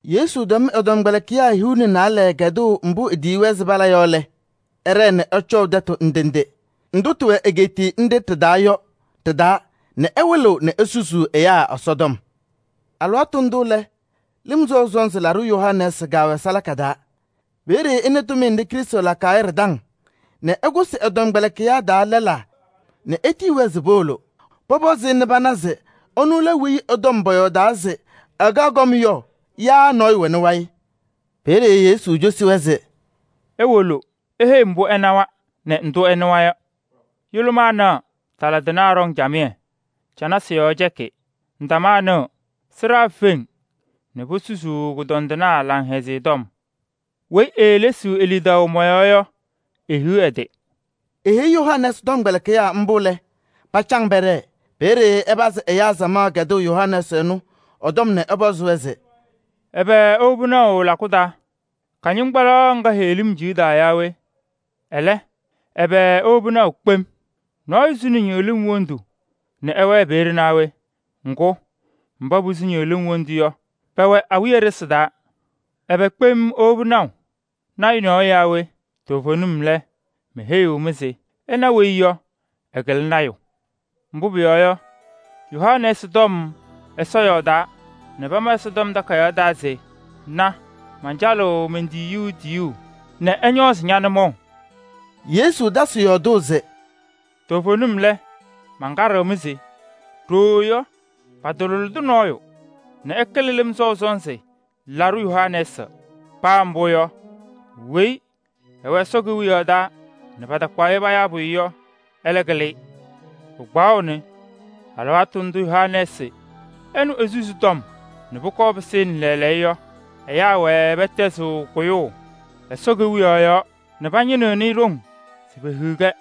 Yesu tɛm ɛ-tɔmkpɛlɩkɩyaa hiu nɛ naalɛ kɛdʋʋ mbʋ etiyiɣ-wɛ se pala yɔ lɛ, ɛɖɛɛ nɛ ɛcɔʋ tɛtʋ ndʋ ndʋ tɩwɛ egeetiye nɖɩ ɖɩ-taa yɔ tɩ-taa nɛ ɛwɩlɩɣ nɛ esusuu ɛyaa Ɛsɔtɔm. Alɩwaatʋ ndʋ lɛ, Lɩm Sɔʋ Sɔnzɩ Laɖʋ Yohanɛɛsɩ kɛwɛ salaka taa. Peeye ɛnɩ tʋmɩyɛ nɖɩ Krɩstʋ lakaɣ yɔ ɖɩ-taŋ nɛ ɛkʋsɩ ɛ-tɔmkpɛlɩkɩyaa taa lɛlaa nɛ etiyi-wɛ se powolo pɔpɔzɩ-ɩ nɛ pana se ɛnʋ lɛ weyi ɛ-tɔm paayɔɔdaa se ɛkaɣ kɔm yɔ yaa nɔɔyʋ wɛnɩ wayɩ? Peeye Yesu cosi-wɛ se: “Iwolo iheyi-i mbʋ ɩnawa nɛ ndʋ ɩnɩwa yɔ: yʋlʋmaa naɣ nɛ tala tɩnaa ɖɔŋ camɩyɛ nɛ canasɩ yɔɔ cɛkɩ nɛ ndamaa nɩɣ nɛ sɩɖaa feŋ, posusaɣ kʋñɔndɩnaa Laŋhɛzɩyɛ Tɔm. Weyi eelesiɣ e-lidaʋ mɔ-yɔɔ yɔ, ehiɣ ɛ-tɩ!” Eheyi Yohanɛɛsɩ tɔmkpɛlɩkɩyaa mbʋ lɛ, pacaŋ pɛɖɛɛ. Peeye ɛpazɩ ɛyaa samaɣ kɛdʋʋ Yohanɛɛsɩ ɛnʋ ɛ-tɔm nɛ ɛpɔzɩ-wɛ se: “Ɛbɛ iwobi naʋ lakʋ taa? Kɩñɩŋgbaɖɛ nɖɩ heɣlim ciɣdaɣ yɔ yaa we? Ɛlɛ, ɛbɛ iwobi naʋ kpem? Nɔɔyʋ suni ñɩɣlɩm wondu nɛ ɛwɛɛ peeye naa wɛ? Ŋgʋ, mba posuu ñɩɣlɩm wondu yɔ, pɛwɛɣ awiya ɖɩsɩ taa. Ɛbɛ kpem iiwobi naʋ? Lɔɔyaɣ tʋ nɔɔyʋ yaa we? Toovenim lɛ, meheyiɣ-mɩ se ɩna weyi yɔ, ɛkɩlɩ lɔɔyaɣ tʋ. Mbʋ pʋyɔɔ yɔ, Yohanɛɛsɩ tɔm Ɛsɔ yɔɔdaa nɛ pama Ɛsɔtɔm Takayaɣ taa se: ‘Na, mancalɩɣ men-tiyiyu tiyuu nɛ ɛñɔɔzɩ ña-nʋmɔʋ.’” Yesu tasɩ yɔɔdʋʋ se: “Toovenim lɛ, mankaɖɩɣ-mɩ se ɖooo yɔ, patalʋlɩdɩ nɔɔyʋ nɛ ɛkɩlɩ Lɩm Sɔʋ Sɔnzɩ Laɖʋ Yohanɛɛsɩ. Paa mbʋ yɔ, weyi ɛwɛ Ɛsɔ Kewiyaɣ taa nɛ patakpaɣ-ɩ payaa pʋyʋ yɔ, ɛlɛ kɩlɩ-ɩ. Pɩkpaɣʋnɩ alɩwaatʋ ndʋ Yohanɛɛsɩ ɛnʋ esusi tɔm nɛ pʋkɔɔ pɩsɩnɩ lɛɛlɛɛyɔ yɔ, ɛyaa wɛɛ pɛtɛzɩɣ kʋyʋʋ Ɛsɔ Kewiyaɣ yɔɔ nɛ pañɩnɩɣnɩ ɖoŋ se pehiɣ-kɛ.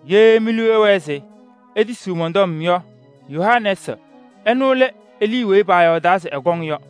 Ye mi-liu ɛwɛɛ se itisiɣ mɔn-tɔm yɔ, Yohanɛɛsɩ ɛnʋ lɛ Elii weyi paayɔɔdaa se ɛkɔŋ yɔ.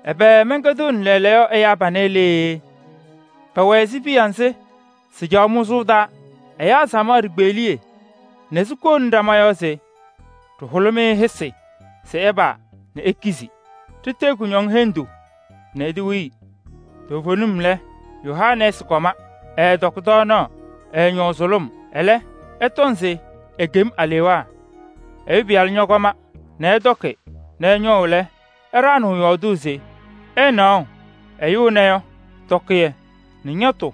“Ɛbɛ mɛnkɛdɩɣnɩ lɛɛlɛɛyɔ ɛyaa panɛ lee? Pɛwɛ ɛzɩ piya nzɩ sɩcaɣ mʋzʋʋ taa ɛyaa samaɣ ɖikpeɣliye nɛ sikou ɖama yɔɔ se: ‘Ɖɩhʋlɩ-mɩ hɩsɩ se ɩpaa nɛ ikizi. Ɖitee kʋñɔŋ hendu nɛ itewii.’ Toovenim lɛ, Yohanɛɛsɩ kɔma, ɛɛtɔkɩ tɔɔnaɣ, ɛɛñɔʋ sʋlʋm. Ɛlɛ, ɩtɔŋ se ekem alewaa. Ɛyʋ Pɩyalʋ ñɔkɔma nɛ ɛtɔkɩ nɛ ɛñɔʋ lɛ, ɩɖaɣnɩɣ yɔɔdʋʋ se: ‘Ɩnaɣʋ ɛyʋ ɛnɛ yɔ, tɔkɩyɛ nɛ ñɔtʋ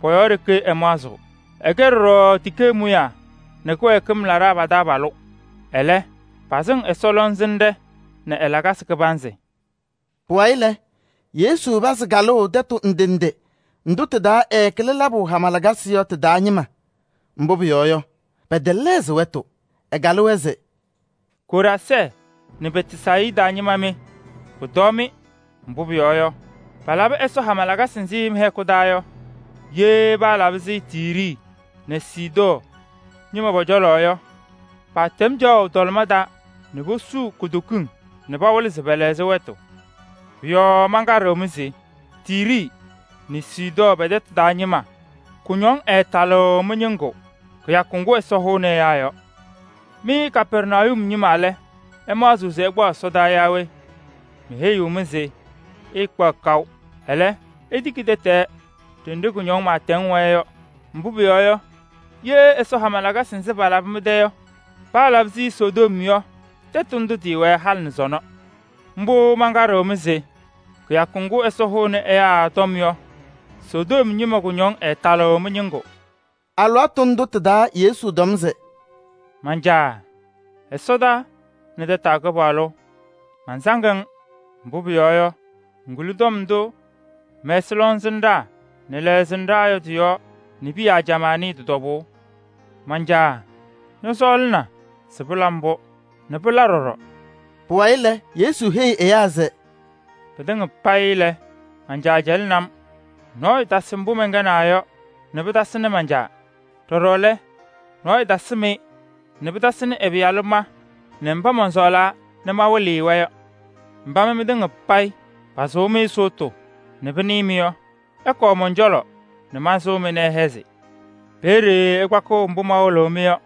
pɔ-yɔɔ ɖeke ɛmaɣzɩɣ. Ɛkɛ ɖɔɖɔ tikee mʋyaa nɛ kɩwɛɛkɩm laɖaa lɛlaa pa-taabalʋ.’ Ɛlɛ, pasɩŋ Ɛsɔ lɔŋsɩnɖɛ nɛ ɛ-lakasɩ.” Pʋwayɩ lɛ, Yesu pazɩ kalʋʋ tɛtʋ ndʋ ndʋ tɩ-taa ɛɛkɩlɩ labʋ hama lakasɩ yɔ tɩ-taa ñɩma. Mbʋ pʋyɔɔ yɔ, pɛtɛlɛɣzɩ wɛtʋ, ɛkalɩ-wɛ se: “Koraazɛɛ nɛ Bɛtsayɩda ñɩma mɩ! Pʋtɔɔ-mɩ! Mbʋ pʋyɔɔ yɔ, palabɩ Ɛsɔ hama lakasɩ nzɩ mɩ-hɛkʋ taa yɔ, ye paalabɩ-sɩ Tiiri nɛ Sidɔɔ ñɩma pɔ-cɔlɔ yɔ, paatɛm caɣʋ tɔlɩma taa nɛ posuu kutokiŋ nɛ pɩwɩlɩ se pɛlɛɣzɩ wɛtʋ. Pʋ-yɔɔ mankaɖɩɣ-mɩ se Tiiri nɛ Sidɔɔ pɛ-tɛtʋ taa ñɩma kʋñɔŋ ɛɛtalɩɣ mɩ-ñɩŋgʋ kɩyakʋ ŋgʋ Ɛsɔ hʋʋnɩ ɛyaa yɔ. Mɩ Kapɛrnayum ñɩma lɛ, ɩmaɣzɩɣ se ɩkpaɣ ɛsɔdaa yaa we? Meheyiɣ-mɩ se ɩɩkpaɣ kaʋ. Ɛlɛ, itiki tɛtɛɛ ɖenɖe kʋñɔŋ pɩɩtɛŋ wɛɛ yɔ. Mbʋ pʋyɔɔ yɔ, ye Ɛsɔ hama lakasɩ nzɩ palabɩ mɩ-tɛ yɔ, paalabɩ-sɩ Sodom yɔ, tɛtʋ ndʋ tɩɩwɛ halɩ nɛ sɔnɔ. Mbʋ mankaɖɩɣ-mɩ se kɩyakʋ ŋgʋ Ɛsɔ hʋʋnɩ ɛyaa yɔ, Sodom ñɩma kʋñɔŋ ɛɛtalɩɣ mɩ-ñɩŋgʋ.” Alɩwaatʋ ndʋ tɩ-taa Yesu tɔm se: “Man-Caa! Ɛsɔdaa nɛ tataa Kɩpaɣlʋ! Mansaŋ-ŋ. Mbʋ pʋyɔɔ yɔ, ŋkuli tɔm ndʋ ŋmɛsɩ lɔŋsɩnɖaa nɛ lɛɣsɩnɖaa yɔ tɩ-yɔɔ nɛ piya ajamaa nɩɩ tɩ-tɔbʋʋ. Man-Caa! Ñɔsɔɔlɩna se pɩla mbʋ nɛ pɩla ɖɔɖɔ.” Pʋwayɩ lɛ, Yesu heyi ɛyaa se: “Pɩtɩŋa payɩ lɛ, man-Caa cɛlɩnɩ-m. Nɔɔyʋ tasɩ mbʋ mɛnkɛnaa yɔ nɛ pɩtasɩnɩ man-Caa. Ɖɔɖɔ lɛ, nɔɔyʋ tasɩm-ɩ nɛ pɩtasɩnɩ ɛ-Pɩyalʋ ma nɛ mba mɔnsɔɔlaa nɛ mawɩlɩ-ɩ-wɛ yɔ. “Mba mɩ mɩtɩŋa payɩ pasʋʋ-mɩ sʋʋtʋ nɛ pɩnɩɩ-mɩ yɔ, ɩkɔɔ mɔn-cɔlɔ nɛ mansʋʋ-mɩ nɛ ɩhɛzɩ. Peeye ɩkpakɩɣ mbʋ mawɩlɩɣ-mɩ yɔ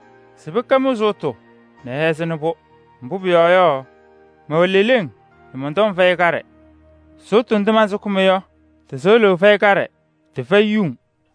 se pɩkɛ mɩ-sʋʋtʋ nɛ ɩhɛzɩnɩ-pʋ. Mbʋ pʋyɔɔ yɔ, mɛwɛ leleŋ, mɔn-tɔm fɛyɩ kaɖɛ. Sʋʋtʋ ndʋ mansʋkɩ-mɩ yɔ, tɩ-sɩɣlʋʋ fɛyɩ kaɖɛ, tɩfɛyɩ yuŋ.”